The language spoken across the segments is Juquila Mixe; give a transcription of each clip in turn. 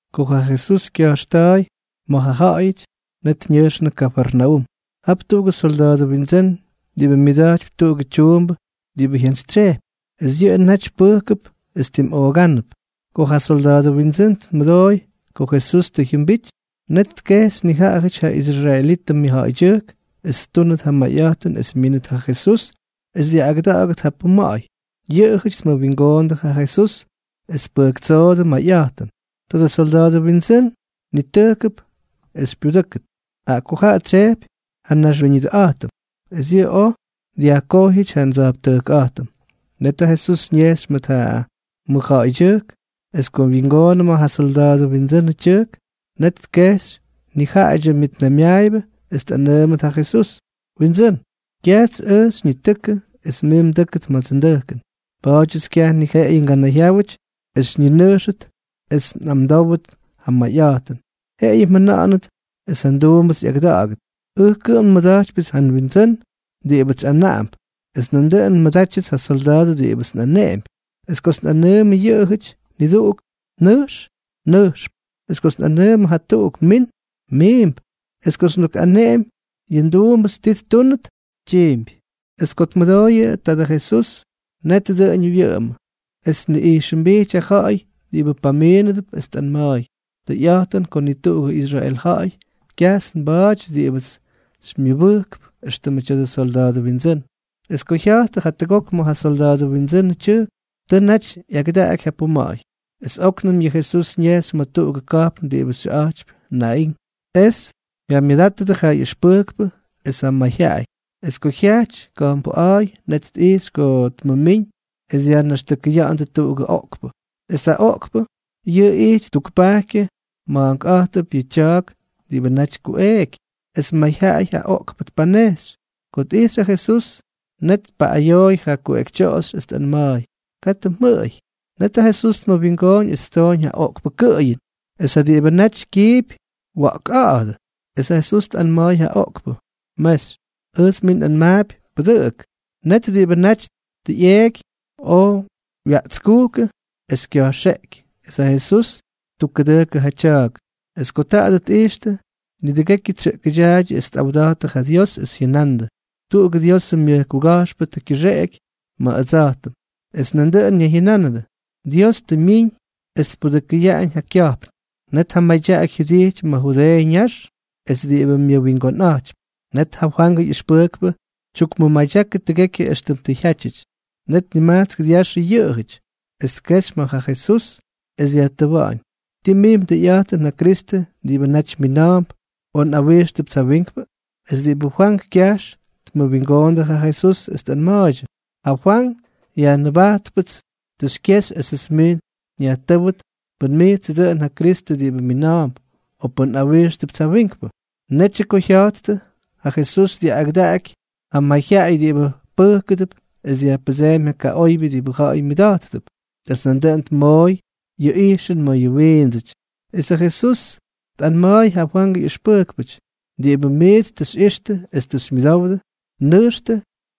Ko ja Jesús kyajxta̱a̱y ma̱ ja ja̱ꞌa̱yʉty, net ñʉjxnʉ Kafarnaúm. Jap tuꞌugʉ solda̱a̱dʉ windsʉ́n diꞌibʉ myʉda̱jtypy tuꞌugʉ tyuumbʉ diꞌibʉ jyantsytsyejpy. Es yʉꞌʉ naty pʉjkʉp es tim oogánʉp. Ko ja solda̱a̱dʉ windsʉ́n tmʉdooy ko Jesús tʉ jyʉmbity, net tkejxy nijaꞌajʉty ja israelitʉ mʉjja̱ꞌa̱ydyʉjk es ttúnʉt ja mayꞌa̱jtʉn es myínʉt ja Jesús es dyaꞌꞌagʉda̱ꞌa̱gʉt ja puma̱ꞌa̱y. Yʉꞌʉjʉty tmʉwingoondʉ ja Jesús es tpʉjktsoodʉ mayꞌa̱jtʉn: —Tadʉ solda̱a̱dʉ windsʉ́n nitʉjkʉp es xypyudʉ́kʉt, jaꞌa ko yʉꞌʉ tsyejpy ja nnaxwiñʉdʉꞌa̱jtʉm, es yʉꞌʉ oj dyajkojyʉty ja ndsa̱jptʉjkꞌa̱jtʉm. Net ja Jesús ñejxy mʉt ja mʉjja̱ꞌa̱ydyʉjk. Es ko wyingoonʉ ma̱ ja solda̱a̱dʉ windsʉnʉ tyʉjk, net tkejxy nijaꞌadyʉ myʉtnaymyaayʉbʉ es tꞌanʉʉmʉt ja Jesús: —Windsʉ́n, kyajts ʉj xyñitʉkʉ es mij mdʉ́kʉt ma̱dsʉ ndʉjkʉn. Pa̱a̱dyʉts kyaj ni jeꞌeyʉ nganayjyáwʉty es nninʉjxʉt es nꞌamdówʉt ja mayꞌa̱jtʉn. Jeꞌeyʉ mjʉna̱ꞌa̱nʉt es ja nduumbʉts ꞌyagʉda̱ꞌa̱gʉt. Ʉj kʉꞌʉm nmʉda̱jtypyʉts ja nwindsʉ́n diꞌibʉts xyꞌanaꞌamp, es nandʉꞌʉn nmʉdátyʉts ja solda̱a̱dʉty diꞌibʉts nꞌaneꞌempy. Es kots nꞌanʉʉmʉ yʉꞌʉjʉty niduꞌuk: “Nʉjx”, nʉjxp; es kots nꞌanʉʉmʉ jatuꞌuk: “Min”, miimp; es kots ndukꞌaneꞌemy yʉ nduumbʉts ti ttúnʉt, tyiimpy. Es ko tmʉdooyʉ taadʉ Jesús, net dʉꞌʉñʉ wyʉꞌʉmʉ, es tniꞌijxʉmbijty ja ja̱ꞌa̱y diꞌibʉ pamiinʉdʉp es tꞌanma̱a̱y: —Tʉyꞌa̱jtʉn ko ni tuꞌugʉ Israel ja̱ꞌa̱y kyajts nba̱a̱ty diꞌibʉts xymyʉbʉjkp éxtʉmʉ tya̱dʉ solda̱a̱dʉ windsʉ́n. Es ko jya̱jttʉ jatʉgok ma̱ ja solda̱a̱dʉ windsʉnʉ tyʉjk, tʉ naty ꞌyagʉdaꞌaky ja puma̱ꞌa̱y. Es óknʉm yʉ Jesús ñejxy ma̱ tuꞌugʉ ka̱jpn diꞌibʉ xyʉꞌa̱jtypy Naín. Es jyamyʉdátʉdʉ ja ꞌyʉxpʉjkpʉ es ja mayjyaꞌay. Es ko jyajty ka̱jpnbʉꞌa̱a̱y, net tꞌijxy ko tmʉmíñ es dyajnaxtʉkʉya̱ꞌa̱ndʉ tuꞌugʉ oꞌkpʉ. Es ja oꞌkpʉ yʉꞌʉ ijty tukpajkyʉ ma̱a̱nkꞌa̱jtʉp yʉ tya̱a̱k diꞌibʉ naty kuꞌeeky. Es mayjyaꞌay ja oꞌkpʉ tpanejxy. Ko tꞌijxy ja Jesús, net tpaꞌꞌayooy ja kuꞌekytyoꞌoxy es tꞌanma̱a̱y: —Katʉ mjʉꞌʉy. Net ja Jesús tmʉwingooñ es ttooñ ja oꞌkpʉ kʉꞌʉyʉn, es ja diꞌibʉ naty kyiipy wya̱ꞌkꞌa̱ꞌa̱dʉ. Es ja Jesús tꞌanma̱a̱y ja oꞌkpʉ: —Mexy, ʉjts mij nꞌanmaapy: ¡Pʉdʉꞌʉk! Net diꞌibʉ naty tʉ ꞌyeeky oj wyaꞌtskujkʉ es kya̱jxeꞌky, es ja Jesús ttukkʉdʉjkʉ ja tya̱a̱k. Es ko taadʉ tꞌijxtʉ, nidʉgekyʉ tsyʉꞌkʉdyaaydyʉ es tꞌawda̱jttʉ ja Dios es jyʉnandʉ: —Tuꞌugʉ Diosʉ myʉj kuga̱jxpʉ tʉ kyʉxeꞌeky ma̱ ʉdsa̱jtʉm. Es nandʉꞌʉn ñayjyʉnánʉdʉ: —Dios tʉ myiñ es tpudʉkʉyaꞌañ ja kya̱jpn. Net ja madyaꞌaky jyʉdijty ma̱ Judeeʉ ñax es diꞌibʉ myʉwingonꞌa̱jtypy. Net ja Fwangʉ ꞌyʉxpʉjkpʉ tyukmʉmadyákʉdʉ tʉgekyʉ éxtʉm tʉ jyátyʉty. Net nimajtsk dyaxʉ yʉꞌʉjʉty, es tkejxy ma̱ ja Jesús es dyajtʉwa̱ꞌa̱ñ: —¿Ti mij mdʉyꞌa̱jtʉn ja Kristʉ diꞌibʉ naty mina̱a̱mp, o nꞌawíxtʉpts ja wiinkpʉ? Es diꞌibʉ Fwank kyajx tmʉwingoondʉ ja Jesús es tꞌanma̱a̱ydyʉ: —Ja Fwank Yajnʉbajtpʉts tʉ xykyexy esʉts mij nyajtʉ́wʉt pʉn mijtsʉ dʉꞌʉn ja Kristʉ diꞌibʉ mina̱a̱mp, o pʉn nꞌawíxtʉpts ja wiinkpʉ. Netyʉ ko jya̱jttʉ, ja Jesús dyaꞌꞌagʉdaky ja mayjyaꞌay diꞌibʉ pʉjkʉdʉp es dyajpʉdsémy ja kaꞌoybyʉ diꞌibʉ ja̱ꞌa̱y myʉda̱jttʉp, es nandʉꞌʉn tmooy yʉ ijxʉn mayʉ wiindsʉty. Es ja Jesús tꞌanma̱a̱y ja Fwangʉ ꞌyʉxpʉjkpʉty: —Diꞌibʉ miits tʉ xyꞌixtʉ es tʉ xymyʉdowdʉ, nʉjxtʉ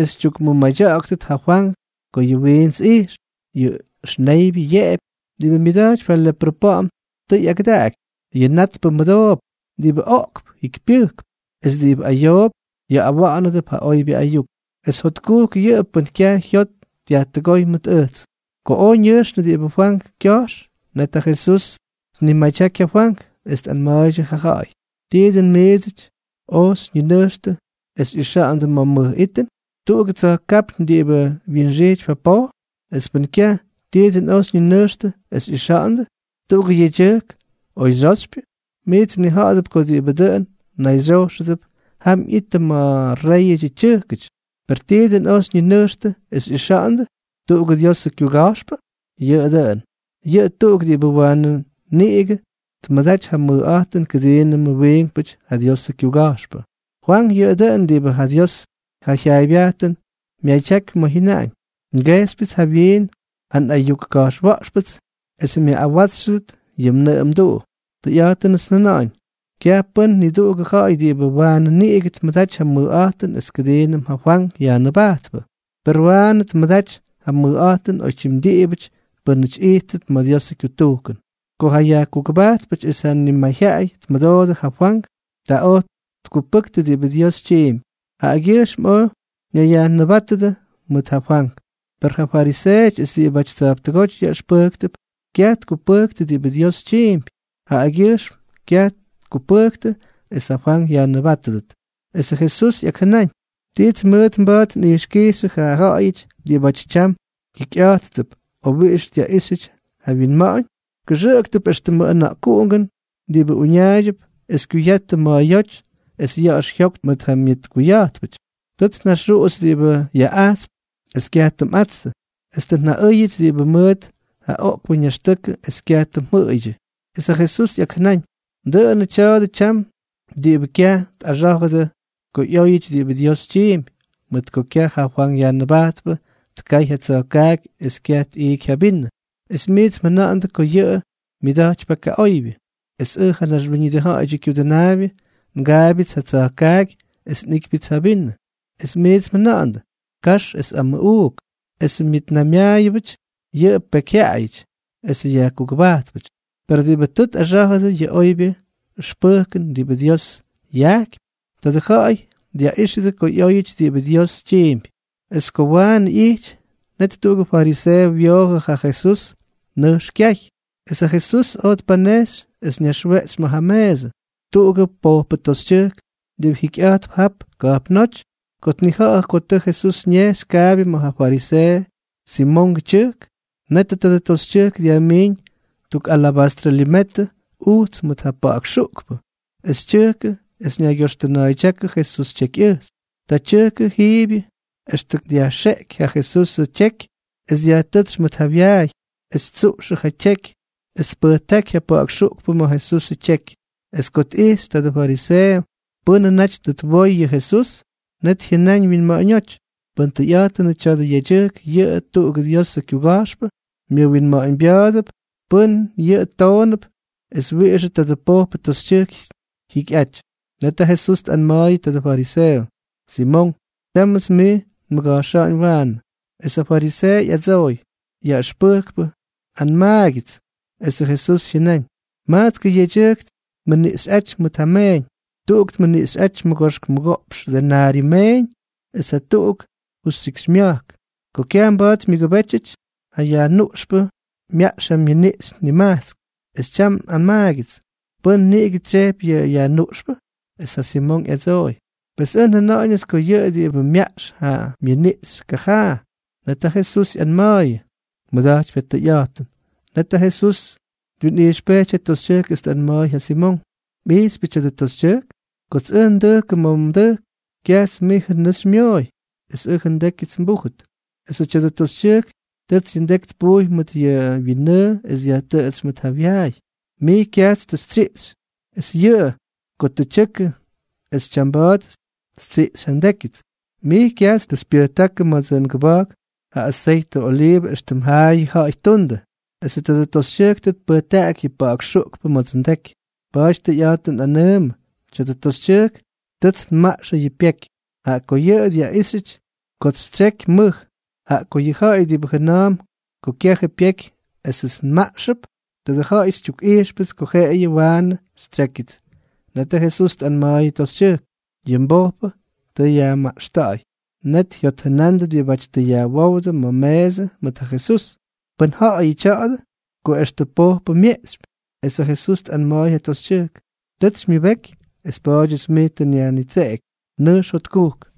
es xytyukmʉmadya̱ꞌa̱ktʉt ja Fwank ko yʉ wiints ijxp, yʉ ʉxneybyʉ yeꞌepy, diꞌibʉ myʉda̱jtypy ja leprʉ pa̱ꞌa̱m tʉ ꞌyagʉdaꞌaky, yʉ natpʉ mʉdoop, diꞌibʉ oꞌkp jikypyʉjkp es diꞌibʉ ayoop yaꞌꞌawánʉdʉp ja oybyʉ ayuk, es jotkujk yʉꞌʉ pʉ́n kyaj jyot dyajtʉgóy mʉt ʉjts. Ko oj ñʉjxnʉ diꞌibʉ Fwank kyajx, net ja Jesús tnimadyaky ja Fwank es tꞌanma̱a̱ydyʉ ja ja̱ꞌa̱y: —¿Ti dʉn miidsʉty oj xyñinʉjxtʉ es xyꞌixa̱ꞌa̱ndʉ ma̱ mʉj itʉn? ¿Tuꞌugʉ tsa̱jkápyñ diꞌibʉ wyinxijtypy ja poj? Es pʉn kyaj, ¿ti dʉn oj xyñinʉjxtʉ es xyꞌixa̱ꞌa̱ndʉ? ¿Tuꞌugʉ yedyʉjk oy xyoxypyʉ? Miits mnija̱ꞌa̱dʉp ko diꞌibʉ dʉꞌʉn nayxyojxʉdʉp jam ꞌyittʉ ma̱ réyʉdyʉ tyʉjkʉty. ¿Per ti dʉn oj xyñinʉjxtʉ es xyꞌixa̱ꞌa̱ndʉ? ¿Tuꞌugʉ Diosʉ kyuga̱jxpʉ? Yʉꞌʉ dʉꞌʉn. Yʉꞌʉ tuꞌuk diꞌibʉ waanʉ niꞌigʉ tmʉdaty ja mʉjꞌa̱jtʉn kʉdiinʉmʉ wiinkpʉty ja Diosʉ kyuga̱jxpʉ. Fwank yʉꞌʉ dʉꞌʉn diꞌibʉ ja Diosʉ jyaaybyajtʉn myadyakypy ma̱ jyʉnaꞌañ: Ngejxypyʉts jawyiin ja nꞌayuk ka̱jxwa̱ꞌxpʉts es myaꞌꞌawátsxʉdʉt yʉ mnʉꞌʉ mduꞌu. Tʉyꞌa̱jtʉnʉts njʉna̱ꞌa̱ñ: Kyaj pʉ́n niduꞌugʉ ja̱ꞌa̱y diꞌibʉ waanʉ niꞌigʉ tmʉdaty ja mʉjꞌa̱jtʉn es kʉdiinʉm ja Fwank Yajnʉbajtpʉ. Per waanʉ tmʉdaty ja mʉjꞌa̱jtʉn oytyim diꞌibʉty pʉ́nʉty ijttʉp ma̱ Diosʉ kyutujkʉn. Ko ja yajkugʉbajtpʉty es ja nimayjyaꞌay tmʉdoodʉ ja Fwank, ta oj tkupʉktʉ diꞌibʉ Dios tyiimpy, jaꞌagyʉjxm oj ñayyajnʉbajtʉdʉ mʉt ja Fwank. Per ja fariseeʉty es diꞌibʉty tsa̱jptʉgóty yaꞌʉxpʉjktʉp kyaj tkupʉjktʉ diꞌibʉ Dios tyiimpy, jaꞌagyʉjxm kyaj tkupʉjktʉ es ja Fwank yajnʉbátʉdʉt. Esʉ Jesús ꞌyakjʉnáñ: —¿Tits mʉʉt mba̱a̱t nꞌijxkijxyʉ ja ja̱ꞌa̱yʉty diꞌibáty tyam jyikyꞌa̱jttʉp, o wiꞌix dyaꞌíxyʉty ja wyinma̱ꞌa̱ñ? Kʉxʉꞌktʉp éxtʉmʉ ʉna̱ꞌkuꞌungʉn diꞌibʉ uñaaydyʉp es kyuyattʉ ma̱a̱yóty es ya̱ꞌa̱x jyoktʉ mʉt ja myʉtkuya̱jtpʉty: “Tʉts njaxuꞌuxy diꞌibʉ yaꞌꞌajtsp es kyaj tʉ mꞌatstʉ; es tʉ njaꞌʉ́yʉts diꞌibʉ mʉʉt ja oꞌkpʉ ñaxtʉkʉ, es kyaj tʉ mjʉꞌʉydyʉ.” Es ja Jesús ꞌyakjʉnáñ: —Dʉꞌʉnʉ tya̱a̱dʉ tyam diꞌibʉ kyaj tꞌaxá̱jʉdʉ ko ꞌyóyʉty diꞌibʉ Dios tyiimpy. Mʉt ko kyaj ja Fwank Yajnʉbajtpʉ tkay ja tsa̱jkaaky es kyaj tꞌiiky ja vinʉ, es miits mjʉna̱ꞌa̱ndʉ ko yʉꞌʉ myʉda̱jtypy ja kaꞌoybyʉ. Es ʉj, ja Naxwíñʉdʉ Ja̱ꞌa̱yʉdyʉ Kyudʉnaabyʉ, ngaabyʉts ja tsa̱jkaaky es nꞌiꞌkypyʉts ja vinʉ, es miits mjʉna̱ꞌa̱ndʉ: “Kax es amʉꞌuuk, es myʉtnaymyaayʉp ja pekyjyaꞌayʉty esʉ yajkugʉbajtpʉty.” Per diꞌibʉ tʉ tꞌaxá̱jʉdʉ yʉ oybyʉ ʉxpʉjkʉn diꞌibʉ Dios jyaꞌaꞌa̱jtypy, tadʉ ja̱ꞌa̱y dyaꞌíxʉdʉ ko ꞌyóyʉty diꞌibʉ Dios tyiimpy. Es ko waanʉ ꞌyijty, net tuꞌugʉ fariseeʉ wyoojʉ ja Jesús es nʉjx kyay. Es ja Jesús oj tpanejxy es ñaxweꞌtsy ma̱ ja meesʉ. Tuꞌugʉ pojpʉ toxytyʉjk diꞌibʉ jikyꞌa̱jtp jap ka̱jpnóty, ko tnija̱ꞌa̱jʉ ko tʉ Jesús ñejxy kaabyʉ ma̱ ja fariseeʉ Simongʉ tyʉjk, netʉ tadʉ toxytyʉjk dyajmiiñ tuk alabastrʉ limetʉ ujts mʉt ja pa̱ꞌa̱k xuꞌkpʉ, es tyʉjkʉ es ñaygyoxtʉna̱a̱ydyákʉ Jesús tyekyꞌʉjxy. Ta tyʉjkʉ jiibyʉ extʉ ko dyajxeꞌky ja Jesusʉ tyeky, es dyajtʉ́tsy mʉt ja wyaay es ttsuꞌxʉ ja tyeky es tpʉjtáky ja pa̱ꞌa̱k xuꞌkpʉ ma̱ Jesusʉ tyeky. Es ko tꞌijxy tadʉ fariseeʉ pʉ́nʉ naty tʉ twoy yʉ Jesús, net jyʉnáñ wyinma̱ꞌa̱ñóty: “Pʉn tʉyꞌa̱jtʉnʉ tya̱dʉ yedyʉjk yʉꞌʉ tuꞌugʉ Diosʉ kyuga̱jxpʉ, myʉwinma̱ꞌa̱ñbya̱a̱dʉp pʉ́n yʉꞌʉ toonʉp es wiꞌixʉ tadʉ pojpʉ toxytyʉjk jyikyꞌaty.” Net ja Jesús tꞌanma̱a̱yʉ tadʉ fariseeʉ: —Simonk, tyámʉts mij nmʉga̱jxa̱ꞌa̱ñ waanʉ. Es ja fariseeʉ ꞌyadsooy: —Yaꞌʉxpʉjkpʉ, anmaagyʉts. Esʉ Jesús jyʉnáñ: —Majtskʉ yedyʉjk tmʉniꞌxyꞌáty mʉt ja meeñ. Tuꞌuk tmʉniꞌxyʉty mʉgoxk mʉgoꞌpx denaryʉ meeñ, es jatuꞌuk justyikxymya̱jk. Ko kyaj mba̱a̱t myʉgʉbétyʉty, ja yajnuꞌxpʉ myaꞌx ja myʉniꞌxy nimajtsk. Es tyam anmaagyʉts, ¿pʉ́n niꞌigʉ tsyejpy yʉ yajnuꞌxpʉ? Es ja Simonk ꞌyadsooy: —Pes ʉj njʉna̱ꞌa̱ñʉts ko yʉꞌʉ diꞌibʉ myaꞌx ja myʉniꞌxy kajaa. Net ja Jesús ꞌyanma̱a̱yʉ: —Mmʉda̱jtypy ja tʉyꞌa̱jtʉn. Net ja Jesús twinꞌijxpejty ja toxytyʉjk es tꞌanma̱a̱y ja Simonk: —¿Mꞌijxypyʉ tya̱dʉ toxytyʉjk? Kots ʉj ndʉjkʉ ma̱ mdʉjk, kyajts mijʉ nʉʉ tʉ xymyoꞌoy es ʉjʉ ndékyʉts nbújʉt, esʉ tya̱dʉ toxytyʉjk tʉts yʉ ndeky tpujy mʉt yʉ wyinnʉʉ es dyajtʉꞌʉtsy mʉt ja wyaay. Mij kyajts tʉ xytsyiꞌxy, es yʉꞌʉ ko tʉ tyʉkʉ es tyamba̱a̱t ttsiꞌxy ja ndékyʉts. Mij kyajts tʉ xypyʉjtákʉ ma̱dsʉ ngʉba̱jk ja aseytʉ oliivʉ éxtʉm jaayʉ ja̱ꞌa̱y ttundʉ, esʉ tadʉ toxytyʉjk tʉ tpʉjtaꞌaky yʉ pa̱ꞌa̱k xuꞌkpʉ ma̱dsʉ ndeky. Pa̱a̱ty tʉyꞌa̱jtʉn nꞌanʉʉmʉ, tya̱dʉ toxytyʉjk tʉts nmaꞌxʉ yʉ myʉjpéky, jaꞌa ko yʉꞌʉ dyaꞌíxyʉty kots xytsyeky mʉj. Jaꞌa ko yʉ ja̱ꞌa̱y diꞌibʉ jʉna̱a̱mp ko kyajʉ pyeky es ʉjts nmaꞌxʉp, tadʉ ja̱ꞌa̱y xytyukꞌijxpʉts ko jeꞌeyʉ waanʉ xytsyékyʉts. Net ja Jesús tꞌanma̱a̱y ja toxytyʉjk: —Yʉ mbojpʉ tʉ yajmaꞌxta̱ꞌa̱y. Net jyotjʉnandʉ diꞌibáty tʉ yajwówdʉ ma̱ meesʉ mʉt ja Jesús: —¿Pʉ́n ja̱ꞌa̱yʉ tya̱a̱dʉ?, ko extʉ pojpʉ myeꞌxypy. Es ja Jesús tꞌanma̱a̱y ja toxytyʉjk: —Tʉts xymyʉbeky, es pa̱a̱dyʉts mij tʉ nyajnitseꞌeky. Nʉjx jotkujk.